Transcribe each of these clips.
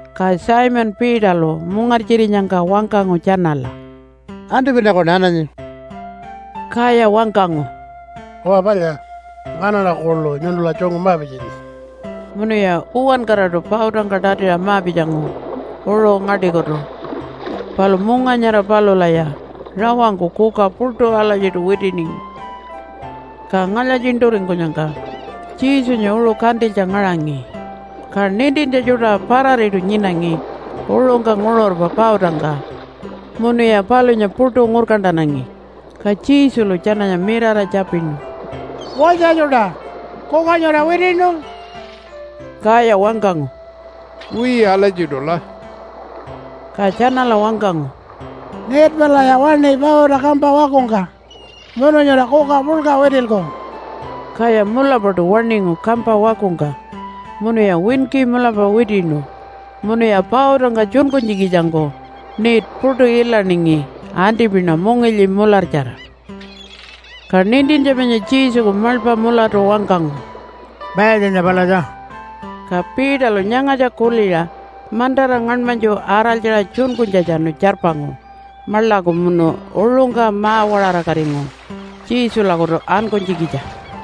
Ka Simon Peterlu mungartjirinyangka wangkangu tjanala, “Antipinakuṉa ananyi.” Kaya wangkangu, “Uwa palya, nganaṉa kuḻu nyuntula tjungu ma-pitjanyi.” Munuya uwankaraṯu pautangka tatiṟa ma-pitjangu uṟu ngaṯikutu. Palu munga nyara palulaya rawangku kuka puṯu alatjiṯu witiningi. Ka ngalya-tjiṉṯuringkunyangka Jesunya uṟu kantilytja ngaṟangi, ka nintintja tjuṯa parariṯu nyinangi uṟungka nguṟurpa pautangka munuya palunya puṯu ngurkantanangi. Ka Jesulu tjananya mirara tjapinu, “Walytja tjuṯa! Kuka nyura witiṉu?” Kaya wangkangu, “Wiya alatjiṯula.” Ka tjanala wangkangu, “Net palaya waṉi pauta kampa wakungka munu nyura kuka puḻka witilku.” Kaya mulapaṯu waṉingu kampa wakungka, munuya winki mulapa witiṉu munuya pautangka tjunkunytjikitjangku net puṯu ilaningi antipina mungilyi mulartjara. Ka nintintja panya Jesuku maḻpa mulatu wangkangu, “Mayatjanya palatja.” Ka Peterlu nyangatja kuliṟa mantara ngaṉmanytju araltjaṟa tjunkunytjatjanu tjarpangu maḻaku munu uṟungka ma-waṟarakatingu Jesulakutu ankunytjikitja.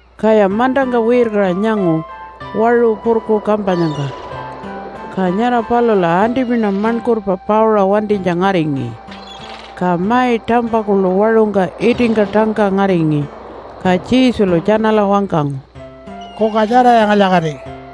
Kaya mantangka wirkaṟa nyangu waṟu purku kampanyangka, ka nyara palula antipina maṉkurpa pauṟa wantinytja ngaringi, ka mai tampa kuḻu waṟungka itingka tangka ngaringi. Ka Jesulu tjanala wangkangu, “Kuka tjaraya ngalya-kati.”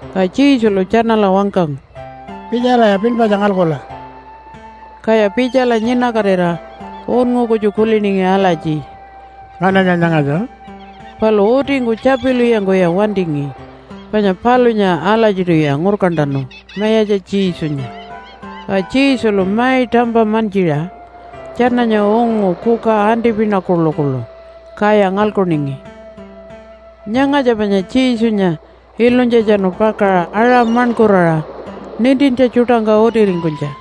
Ka Jesulu tjanala wangkangu, “Pitjalaya pinpatja ngalkula!” Kaya pitjala nyinakatira unngu kutju kuliningi alatji, “Ngananya nyangatja?” Palu utingku tjapilwiyangkuya wantingi, panya palunya alatjiṯuya ngurkantanu Mayatja Jesunya. Ka Jesulu mai tampa mantjiṟa tjananya ungu kuka antipina kuḻukuḻu, kaya ngalkuningi. Nyangatja panya Jesunya ilunytjatjanu pakaṟa aṟa maṉkuraṟa nintintja tjuṯangka utiringkunytja.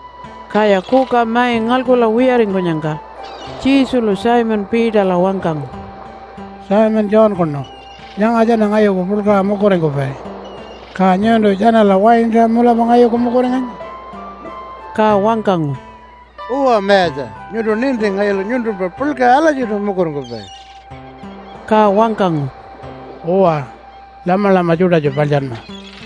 Kaya kuka mai ngalkula wiyaringkunyangka Jesulu Simon Peterla wangkangu, “Simon Johnkunu, nyanga tjana ngayuku puḻkaṟa mukuringkupai. Ka nyuntu tjanala waintaṟa mulapa ngayuku mukuringanyi?” Ka wangkangu, “Uwa Mayatja, nyuntu ninti ngayulu nyuntumpa puḻkaṟa alatjiṯu mukuringkupai.” Ka wangkangu, “Uwa, lamalama tjuṯatju paḻtjanma.”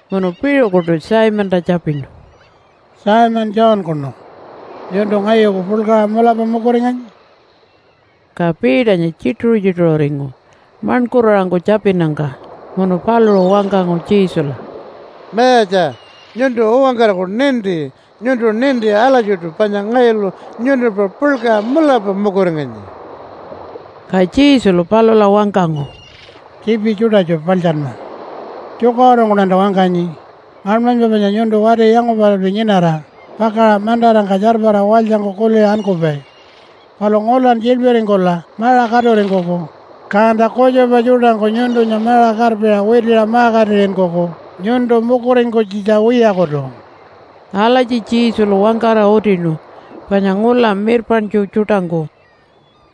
Munu piṟukuṯu Simonta tjapinu, “Simon Johnkunu, nyuntu ngayuku puḻkaṟa mulapa mukuringanyi?” Ka Peternya tjituṟu-tjituṟuringu maṉkuraṟangku tjapinnyangka. Munu paluṟu wangkangu Jesula, “Mayatja, nyuntu uwankaraku ninti. Nyuntu ninti alatjiṯu panya ngayulu nyuntumpa puḻkaṟa mulapa mukuringanyi.” Ka Jesulu palula wangkangu, “Tjiipi tjuṯatju paḻtjanma. Tjukaṟurungkuṉanta wangkanyi, ngaṉmanypa panya nyuntu wati yangupalalpi nyinara pakaṟa mantarangka tjarpara walytjangku kuliṟa ankupai. Palu ngulan tjiḻpiringkula maṟa katuringkuku, kanta kutjupa tjuṯangku nyuntunya maṟa karpiṟa witiṟa ma-katiṟinkuku nyuntu mukuringkunytjitja wiyakutu.” (Alatji Jesulu wangkara utinu panya ngula mirpaṉtju tjuṯangku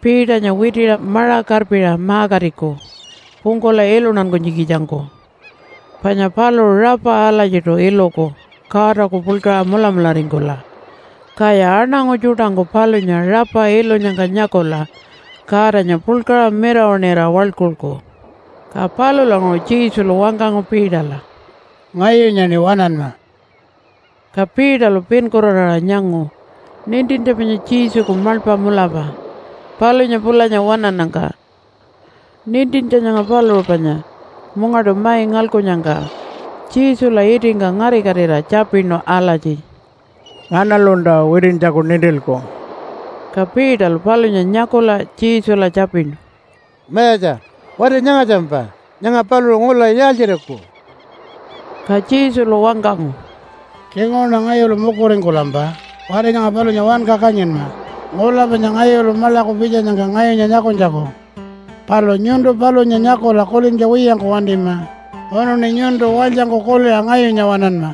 Peternya witiṟa maṟa karpiṟa ma-katiku pungkula iluntankunytjikitjangku. Panya paluṟu rapa alatjiṯu iluku Godaku puḻkaṟa mulamularingkula, kaya aṉangu tjuṯangku palunya rapa ilunyangka nyakula Godanya puḻkaṟa mirawaṉira waḻkulku.) Ka palulanguṟu Jesulu wangkangu Peterla, “Ngayunyaṉi waṉanma.” Ka Peterlu pinkuraraṟa nyangu nintintja panya Jesuku maḻpa mulapa palunya pulanya waṉannyangka. (Nintintja nyanga paluṟu panya mungaṯu mai ngalkunnyangka Jesula itingka ngarikatira tjapinu alatji, “Nganalunta witintjaku nintilku?”) Ka Peterlu palunya nyakula Jesula tjapinu, “Mayatja, wati nyangatjampa? Nyanga paluṟu ngula yaaltjiriku?” Ka Jesulu wangkangu, “Tjinguṟuṉa ngayulu mukuringkulampa wati nyanga palunya wanka kanyinma ngula panya ngayulu maḻaku pitjanyangka ngayunya nyakunytjaku. Palu nyuntu palunya nyakula kulintja wiyangku wantima, munuṉi nyuntu walytjangku kuliṟa ngayunya waṉanma.”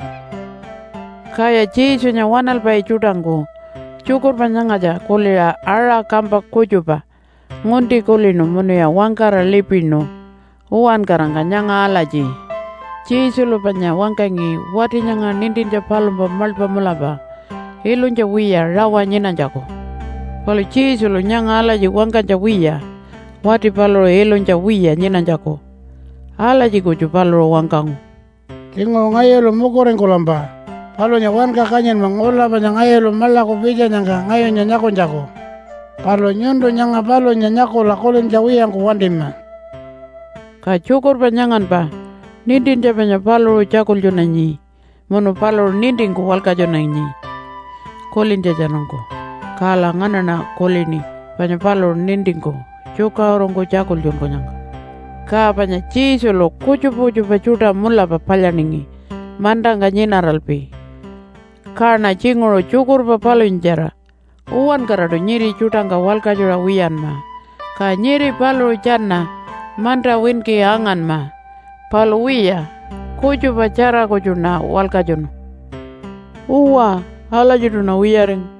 Kaya Jesunya waṉalpai tjuṯangku tjukurpa nyangatja kuliṟa aṟa kampa kutjupa ngunti kulinu munuya wangkara lipinu uwankarangka nyanga alatji, “Jesulu panya wangkangi wati nyanga nintintja palumpa maḻpa mulapa ilunytja wiya rawa nyinanytjaku.” Palu Jesulu nyanga alatji wangkanytja wiya wati paluṟu ilunytja wiya nyinanytjaku. Alatji kutju paluṟu wangkangu, “Tjinguṟu ngayulu mukuringkulampa palunya wanka kanyinma ngula panya ngayulu maḻaku pitjanyangka ngayunya nyakunytjaku. Palu nyuntu nyanga palunya nyakula kulintja wiyangku wantima.” Ka tjukurpa nyanganpa nintintja panya paluṟu tjakultjunanyi munu paluṟu nintingku walkatjunanyi kulintjatjanungku. Kala nganaṉa kulini panya paluṟu nintingku tjukaṟurungku tjakultjunkunyangka. Ka panya Jesulu kutjupa kutjupa tjuṯa mulapa palyaningi mantangka nyinaralpi. Kaṉa tjinguṟu tjukurpa palunyatjara uwankaraṯu nyiri tjuṯangka walkatjuṟa wiyanma, ka nyiri paluṟu tjana manta winki anganma. Palu wiya, kutjupatjara kutjuṉa walkatjunu. Uwa alatjiṯuṉa wiyaringu.